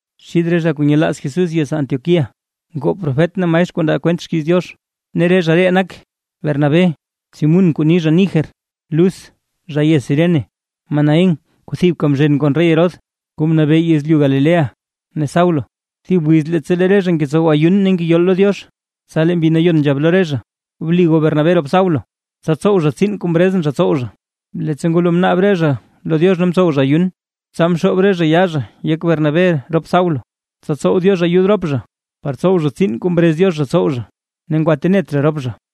Xith re zha kuu nyelaaz Jesús yez Antioquía, ngoo profet ne maestr kuu ndaa kwent xkiiz Diox. Ne re zha ree nak, Bernabé, Simún kuu ni zha Niger, Lus zha yez Cirene, Manaén kuu thibka mzhen kon rey Herodes kuu mnabee yezlyu Galilea ne Saulo. Thib wiz leettsa lee re zha ngetsow ayun ne ngeyol lo Diox. Tsa lee Mbi Nayon nzhab lo re zha: ―Bli goo Bernabé rop Saulo, tsa tsow zha tsiin kuu mrezʼn zha tsow zha. Leettsa ngwalo mnaab re zha lo Diox ne mtsow zha ayun, tsa mxoob re zha yaa zha yek Bernabé rop Saulo, tsa tsow Diox ayud rop zha, par tsow zha tsiin kuu mrez Diox zha tsow zha. Ne ngwatenet zha rop zha.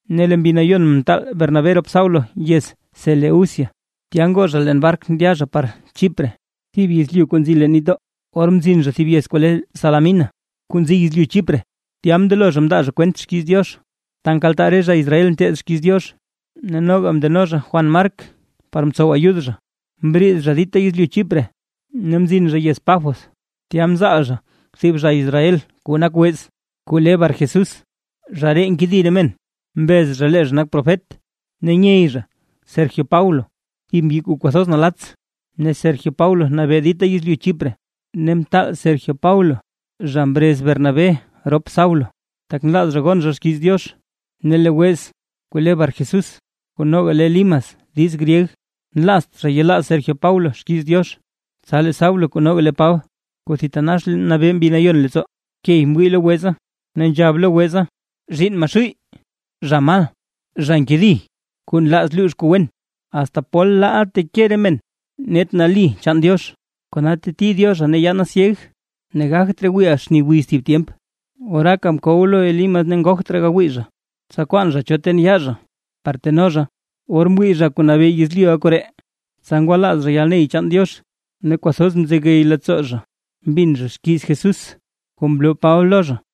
Ne lee Mbi Nayon mtaal Bernabé rop Saulo yez Seleucia, tya ngoo zha leen bark ndya zha par Chipre, thib yezlyu kuu nzi leen nitdoo. Or mzin zha thib yez kuu le Salamina kuu nzi yezlyu Chipre, tya mndelo zha mndaa zha kwent xkiiz Diox ta nkaltaa re zha Israel nteed xkiiz Diox, ne noga mndeno zha Juan Mark par tsow ayud zha. Mbriid zha dita yezlyu Chipre ne mzin zha yez Pafos, tya mzaal zha thib zha Israel kuu nak wez, kuu le Barjesús, zha ree nkedi re men, mbez zha lee zha nak profet. Ne nyey zha Sergio Paulo thib mbyi kuu kwathoz nalatts, ne Sergio Paulo nabee dita yezlyu Chipre, ne mtaal Sergio Paulo zha mrez Bernabé rop Saulo, tak nlaaz zha gon zha xkiiz Diox. Per lee wez Barjesús kuu noga le Elimas diiz gryeg, nlaazt zha yelaaz Sergio Paulo xkiiz Diox. Tsa lee Saulo kuu noga le Paba, kuu thitanax nabee Mbi Nayon leettsoo, key mwii lo weza. Ne nzhab lo weza: ―¡Zhiinn Maxuuy, zha mal, zha nkedi, kuu nlaaz luux kuu wen! ¿Asta pol laaʼa teke re men net nali chaan Diox? Kona teti Diozha ne yaana syeg ne gagt raa wiiʼa xni wiz thib tyemp. Oraaka mkow lo Elimas ne ngogt raa gawii zha, tsa mkwaan zha cho ten yaa zha par teno zha. Or mwii zha kuu nabee yezlyuʼa koree, tsa ngwalaaz zha yalney chaan Diox, ne kwathoz mzegey leettsoo zha mbin zha xkiiz Jesús kuu mloo Paba lo zha.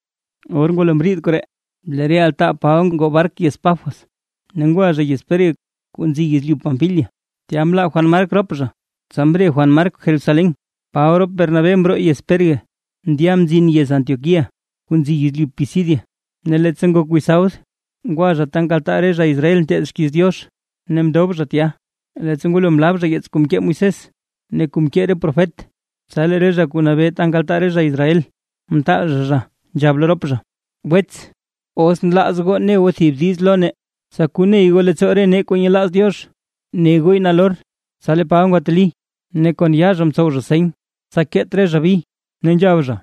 Or ngwalo mriid koree, lee re altaa Paba ngoo bark yez Pafos ne ngwa zha yez Perge kuu nzi yezlyu Panfilia. Tya mlaa Juan Mark rop zha, tsa mre Juan Mark Jerusalén. Paba rop Bernabé mroo yez Perge ndya mzin yez Antioquía kuu nzi yezlyu Pisidia. Ne leettsa ngok wiz sabd ngwa zha ta nkaltaa re zha Israel nteed xkiiz Diox, ne mndob zha tya. Leettsa ngwalo mlaab zha yeets kuu mkee Moisés ne kuu mkee re profet, tsa lee re zha kuu nabee ta nkaltaa re zha Israel, mtaal zha, zha nzhab lo rop zha: ―Wets, ¿os nlaaz goo ne goo thib diiz lo nee, tsa koney goo leettsoo re nee kuu nyelaaz Diox? ¡Ne gooy nalor! Tsa lee Paba ngwateli, ne kon yaa zha mtsow zha seny tsa keet re zha bi, ne nzhab zha: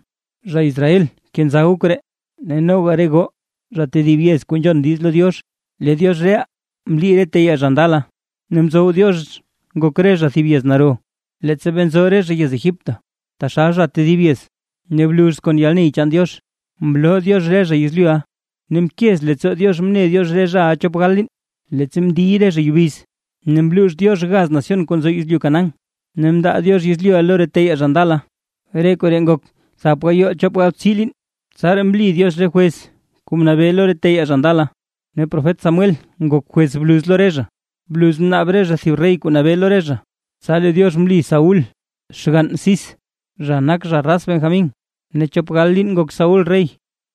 ―Zha Israel kenza goo koree, ne noga re goo zha tedib yez kuu nzhon diiz lo Diox. Lee Diox reʼaa, mli re teyaa zha ndala ne mtsow Diox ngok re zha thib yez naro, leettsa bee nzo re zha yez Egipto taxal zha tedib yez, ne bluz kon yalney chaan Diox, mloo Diox re zha yezlyuʼa. Ne mkez leettsoo Diox mne Diox re zha chop gal liin, leettsa mndiy re zha yubiz, ne mluux Diox gaz nación kuu nzo yezlyu Canaán, ne mndaa Diox yezlyuʼa lo re teyaa zha ndala. Re koree ngok thap gayoo chop galbtsii liin. Tsaraa mli Diox re jwez kuu mnabee lo re teyaa zha ndala, ne profet Samuel ngok jwez bluz lo re zha. Bluz mnaab re zha thib rey kuu nabee lo re zha, tsa lee Diox mli Saúl xgann Cis, zha nak zha raz Benjamín ne chop gal liin ngok Saúl rey.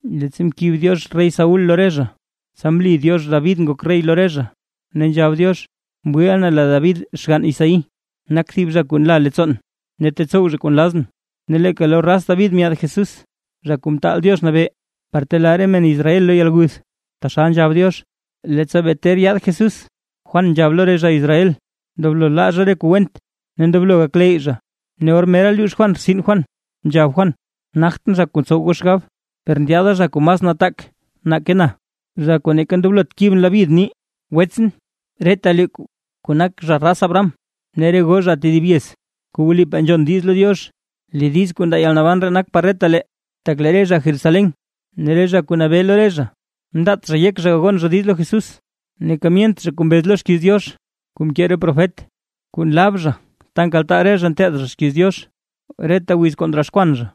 Leettsa mkib Diox rey Saúl lo re zha, tsa mli Diox David ngok rey lo re zha, ne nzhab Diox: “Mwiiʼa na lee David xgann Isaí nak thib zha kuu nlaa leettsoon, ne tetsow zha kuu nlazʼn”. Ne leeka lo raz David myaad Jesús, Zha Kuu Mtaal Diox Nabee, par telaa re men Israel lo yalguth, taxal nzhab Diox. Leettsa bee ter yaad Jesús, Juan nzhab lo re zha Israel ndoblo laa zha re kuu went ne ndoblo gakleyy zha. Ne or mera luux Juan rtsin Juan, nzhab Juan: “¿Nagtʼn zha kuu ntsow goo xgab? Per ndyaada zha kuu mas nataak nake na, zha kuu neeka ndoblotʼn kibʼn labyid nii”. ’Wetsʼn retalee kuu nak zha raz Abraham, ne re goo zha tedib yez kuu wlipaa nzhon diiz lo Diox; lee diiz kuu ndaa yalnaban ree nak par retalee. Tak lee re zha Jerusalén ne re zha kuu nabee lo re zha, mndaat zha yek zha gagon zha diiz lo Jesús, neeka myent zha kuu mbez lo xkiiz Diox kuu mkee re profet, kuu nlab zha ta nkaltaa re zha nteed zha xkiiz Diox reta wiz kuu ndroxkwan zha.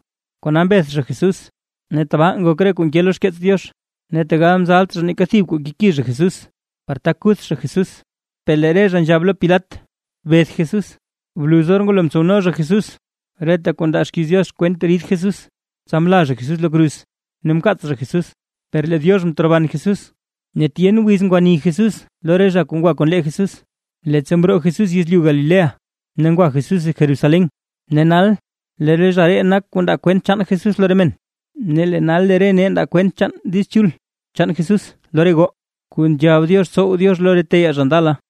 Kona mbeth zha Jesús, ne tabaa ngok re kuu nke lo xkeets Diox. Ne tegal mzalt zha neeka thib kuu keki zha Jesús, par tak kuth zha Jesús, per lee re zha nzhab lo Pilat “¡Beth Jesús!” Bluz or ngwalo mtsowno zha Jesús reta kuu ndaa xkiiz Diox kwent rid Jesús, tsa mla zha Jesús lo kruz ne mkaats zha Jesús. ¡Per lee Diox mteroban Jesús! Ne tyen wiz ngwani Jesús lo re zha kuu ngwa kon lee Jesús, leettsa mroo Jesús yezlyu Galilea ne ngwa Jesús Jerusalén. Ne nal lee re zha ree nak zha kuu ndaa kwent chaan Jesús lo re men. ’Ne lee nal lee re nee ndaa kwent chaan Diiz Chul chaan Jesús lo re goo, kuu nzhab Diox tsow Diox lo re teyaa zha ndala.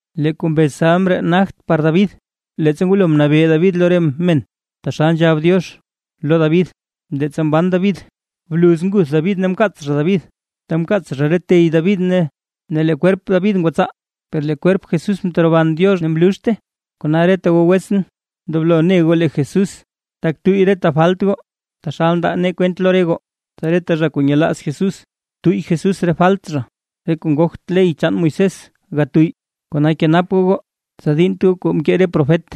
Lee kuu mbez salm ree nagt par David, leettsa ngwalo mnabee David lo re men taxal nzhab Diox lo David leettsa mban David, bluz nguth David ne mkaats zha David, ta mkaats zha re tey David ne lee kwerp David ngwatsaa. Per lee kwerp Jesús mteroban Diox ne mluxte. ’Kona reta goo wetsʼn, ndoblo ne goo lee Jesús tak tuyy reta falt goo, taxal ndaa nee kwent lo re goo, tsa reta zha kuu yelaaz Jesús tuyy Jesús re falt zha. Re kuu ngogt ley chaan Moisés gatuyy. Kona kenap goo goo, tsa diinnt goo re kuu mkee re profet: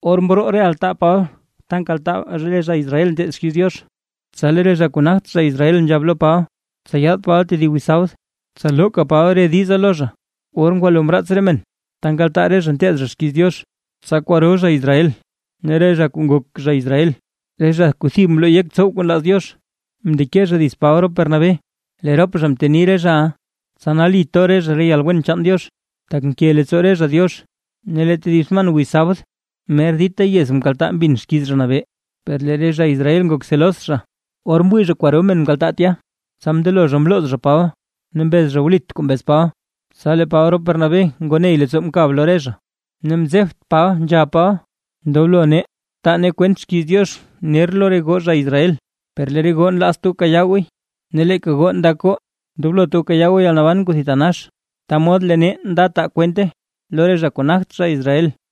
Or mroo re altaa Paba ta nkaltaa re zha Israel nteed xkiiz Diox, tsa lee re zha kuu nagt zha Israel nzhab lo Paba, tsa yaad Paba tedib wiz sabd, tsa looka Paba re diza lo re zha. Or ngwalo mraats re men ta nkaltaa re zha nteed zha xkiiz Diox, tsa kwaro zha Israel, ne re zha kuu ngok zha Israel, re zha kuu thib mloo yek tsow kuu nlaaz Diox, mndeke zha dits Paba rop Bernabé. Lee rop zha mteni re zhaʼa, tsa nali to re zha lo yalwen chaan Diox, tak nke leettsoo re zha Diox. Ne lee tedib sman wiz sabd, mer dita zha yez mkaltaa mbin xkiiz Zha Nabee. Per lee re zha Israel ngok celos zha. Or mwii zha kwaro men mkaltaa tya, tsa mndelo zha mlooz zha Paba, ne mbez zha wlit kuu mbez Paba. Tsa lee Paba rop Bernabé ngoo ney leettsoo mkab lo re zha, ne mzebt Paba nzhab Paba: ―Ndoblo nee, taa nee kwent xkiiz Diox ner lo re goo zha Israel, per lee re goo nlaazt goo kayaa gooy, ne leeka goo ndak goo ndoblot goo kayaa goo yalnaban kuu thitanax, ta mod lee nee nda taa kwente lo re zha kuu nagt zha Israel.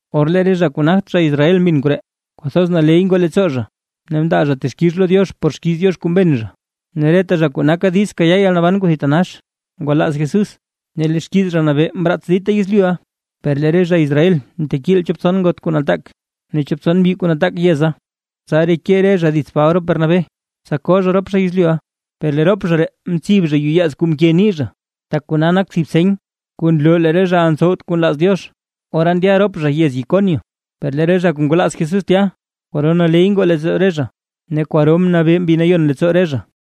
Or lee re zha kuu nagt zha Israel mbin koree, kwathoz naley ngoo leettsoo zha, ne mndaa zha texkix lo Diox por xkiiz Diox kuu mbin zha, ne reta zha kuu naka diiz kayaa yalnaban kuu thitanax ngwalaaz Jesús. Ne lee xkiiz Zha Nabee mraats dita yezlyuʼa. Per lee re zha Israel mtekiil chop tson ngot kuu nataak ne chop tson mbyi kuu nataak yeza, tsa reke re zha dits Paba rop Bernabé, tsa koo zha rop zha yezlyuʼa. Tsa lee rop zha ree mtsib yuyaaz kuu mke nii zha, tak kona nak thib seny kuu nloo lee re zhaʼa ntsowt kuu nlaaz Diox, ora ndya rop zha yez Iconio. Per lee re zha kuu ngwalaaz Jesús tya, kwaro naley ngoo leettsoo re zha ne kwaro mnabee Mbi Nayon leettsoo re zha.